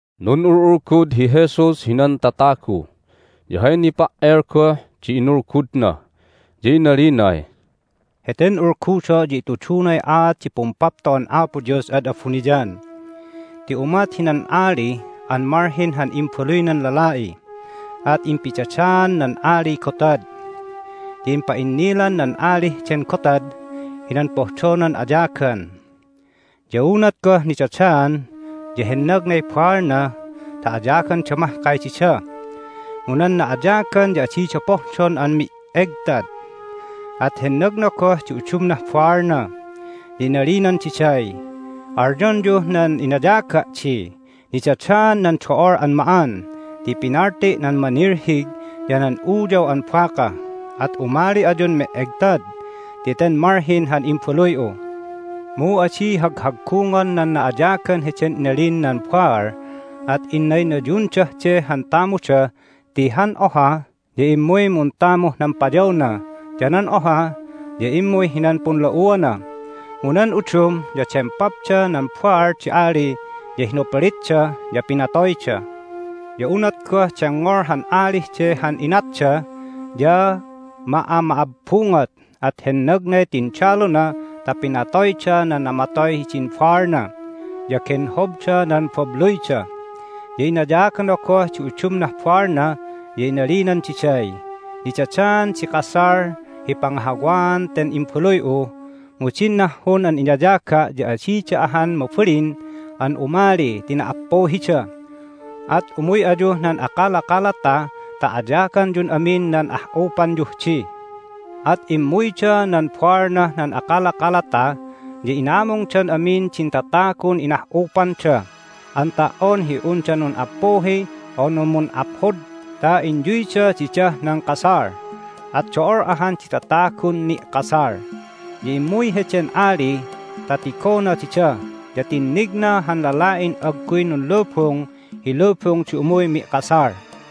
Nun'ul'ulgud hi Jesus hinan tatagu, ya hay nipa"el goh di inulgudna. Ya inalinay, "Heten ulgudo' ya itudunay aat di Pumpapto'an Apo Dios ad abuniyan. Ti umat hinan ali an malhin han imbaluynan lala'i, at impidadaan nan aliy gotad. Ya impa'innilan nan alih den gotad hinan pohdonan ayagan. Ya unat goh nidadaan ya hennagnay baalna ta ayaganda mahkay dida, mu nan na'ayagan ya adida pohdon an me'egtad. At hennagna goh di udumnah baalna, ya inalinan diday, Alyonyuh nan inayaga' di, Nidadaan nan do'ol an ma'an ti pinalti' nan manilhig ya nan uyaw an baka, at umali ayun me'egtad ti ten malhin han imbaluy'u! Mu adi haghaggungon nan na'ayagan heden inalin nan baal, at innayunayundah de han tamuda ti han oha ya immuy muntamuh nan payawna, ya nan oha ya immuy hinan punla'uana, mu nan udum ya dempapda nan baal di ali, ya hinuplitda, ya pinatoyda. Ya unat goh dengngol han alih de han inatda ya ma'ama'abbungot, at hennagnay tindaluna ta pinatoyda nan namatoy hidin baalna, ya genhobda nan babluyda. Ya inayagana goh di udumnah baalna, ya inalinan diday, Nidadaan di kasal hi pangahawaan ten imbaluy'u, mu din nahhun an inayaga' ya adida ahan mabalin an umali ti nappuhida! At umuy ayuh nan akalakalata ta ayaganyun amin nan ah'upanyuh di. At immuyda nan baalnah nan akalakalata, ya inamungdan amin din tatagun inah'upanda an ta"on hi unda nun'appuhi unu mun'aphod ta inyuyda didah nan kasal. At do'ol ahan di tatagun ni'kasal. Ya immuy heden ali ta tigona dida, ya tinnigna han lala'in agguy nunlubung hi lubung di umuy mi'kasal.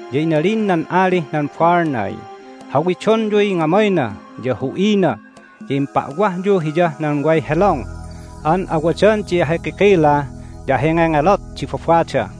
Ya inalin nan alih nan baalnay, Hawidonyuy ngamayna ya hu'ina, ya impa'wahyu hiyah nan way helong an awadan di ahikikila ya ahingengelot di babada."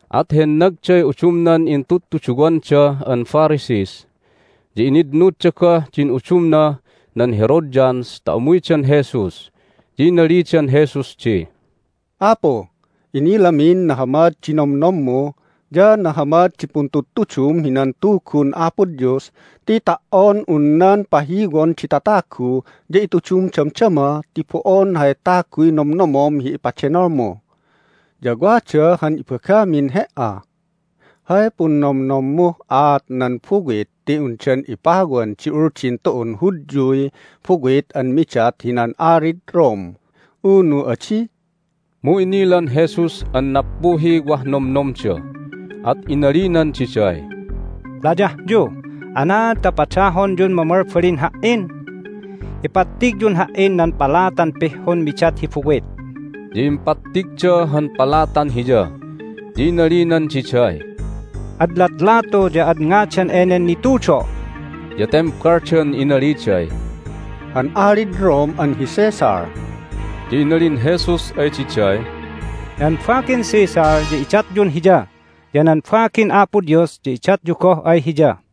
At hennagday udumnan intudtuduwanda an Pharisees, ya initnudda goh din udumnah nan Herodians ta umuydan Jesus. Ya inalidan Jesus di, "Apu, inilamin nahamad di nomnommu, ya nahamad di puntudtudum hinan Tugun Apo Dios ti ta"on un nan pahiwon di tatagu ya itudum damdama ti bo'on hay taguy nomnomom hi ipadenolmu. Ya wada han ibagamin He"a. Hay punnomnommuh aat nan buwit ti undan ipawan di Uldin tu'un Hudyuy buwit an midat hinan alid Rome, unu adi?" Mu inilan Jesus an nappuhiy wah nomnomda, at inalinan diday, "Layahyu! Anaad ta padahonyun mamalbalin Ha"in? Ipattigyun Ha"in nan palatan pihhun midat hi buwit!" Ya impattigda han palatan Hiya. Ya inalinan diday, "Ad latlatu ya ad ngadan enen nitudo'?" Ya tembaldan inaliday, "Han alid Rome an hi Caesar." Ya inalin Jesus ay diday, "Nan bagin Caesar ya idatyun hiya, ya nan bagin Apo Dios ya idatyu goh ay Hiya."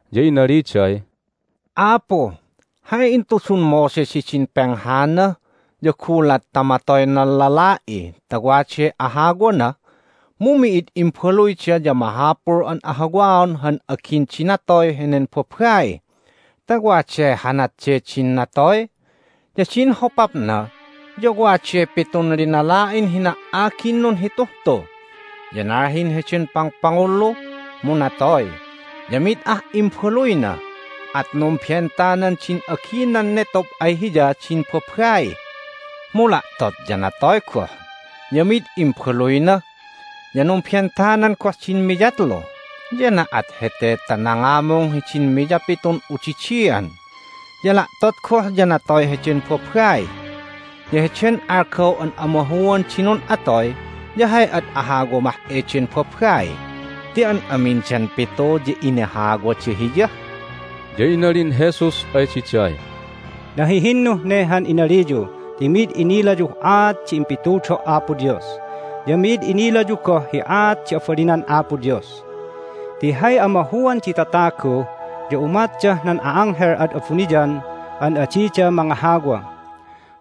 Ya inaliday, "Apu, hay intudun Moses hidin penghana ya gulat ta matoy nan lala'i ta waday ahawana mu mi'id imbaluyda ya mahapul an ahawaon han agin di natoy henen babai ta waday hanat de din natoy. Ya din hopapna ya waday pitun linala'in hina"agin nunhituh tu. Ya nalhin heden pangpangullu, mu natoy, ya mid ah imbaluyna, at numbentanan din aginan netob ay hiya din babai. Mu la'tot ya natoy goh, ya mid imbaluyna. Ya numbentanan goh din miyatlu, ya na'at hete ta nangamung hidin miyapitun udidian. Ya la'tot goh ya natoy heden babai. Ya heden algaw an amahuan di nun'atoy ya hay ad ahawa mah eden babai ti an amindan pitu ya inahawada hiya?" Ya inalin Jesus ay diday, "Nahihinnuh ne han inaliyu ti mi'id inilayuh aat di impitudo' Apo Dios, ya mi'id inilayu goh hi aat di abalinan Apo Dios. Ti hay amahuan di tatagu ya umatdah nan a'anghel ad abuniyan an adida mangahawa.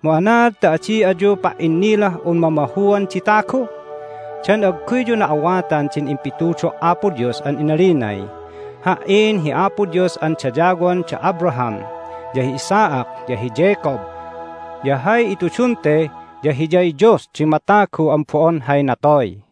Mu anaad ta adi ayu pa"innilah un mamahuan di tagu? Dan agguyyu na'awatan din impitudo' Apo Dios an inalinay, Ha"in hi Apo Dios an dayawon da Abraham, ya hi Isaac, ya hi Jacob? Ya hay itudun te ya Hiyay Dios di matagu an bo'on hay natoy."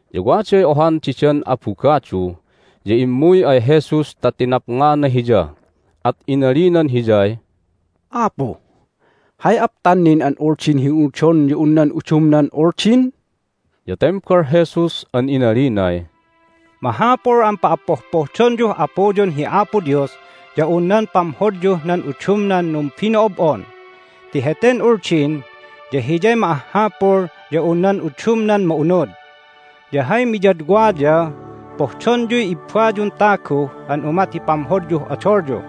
Ya waday ohan didan abugadu, ya immuy ay Jesus ta tinapngana Hiya, at inalinan Hiyay, "Apu, hay aptan nin an Uldin hi unudon ya un nan udumnan Uldin?" Ya tembal Jesus an inalinay, "Mahapul an pa'appohpohdonyuh Apuyun hi Apo Dios ya un nan pamhodyuh nan udumnan numbino'ob'on ti heten Uldin ya hiyay ma'ahhapul ya un nan udumnan ma'unud. Ya hay miyadwa ya, Pohdonyuy ibbayun tagu an umat hi pamhodyuh odolyu.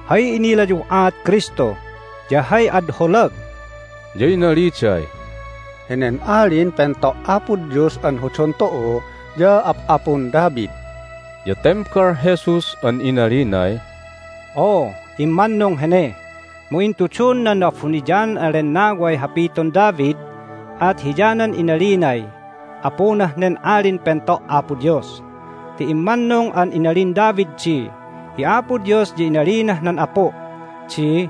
"Hay inilayuh aat Kristu, ya hay ad holag?" Ya inaliday, "Henen Alin Pento' Apo Dios an hodon tu'u ya ap'apun David." Ya tembal Jesus an inalinay, "Oo, immannung hene, mu intudun nan Na'abuniyanan an Lennaway hapiton David, at hiyanan inalinay Apunah nen Alin Pento' Apo Dios. Ti immannung an inalin David di, Hi Apo Dios ya inalinah nan Apu' di,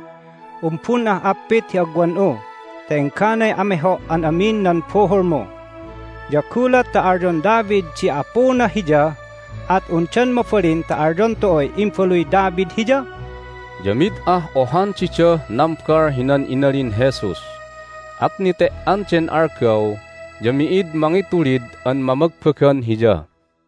Umbun'ah appit hi agwan'u ta engganay ameho' an amin nan buhulmu. Ya gulat ta alyon David di Apuna Hiya at undan mabalin ta alyon tu'uy imbaluy David Hiya?" Ya mid ah ohan didah nambal hinan inalin Jesus, at nete"an den algaw ya mi'id mangitulid an mamagbagan Hiya.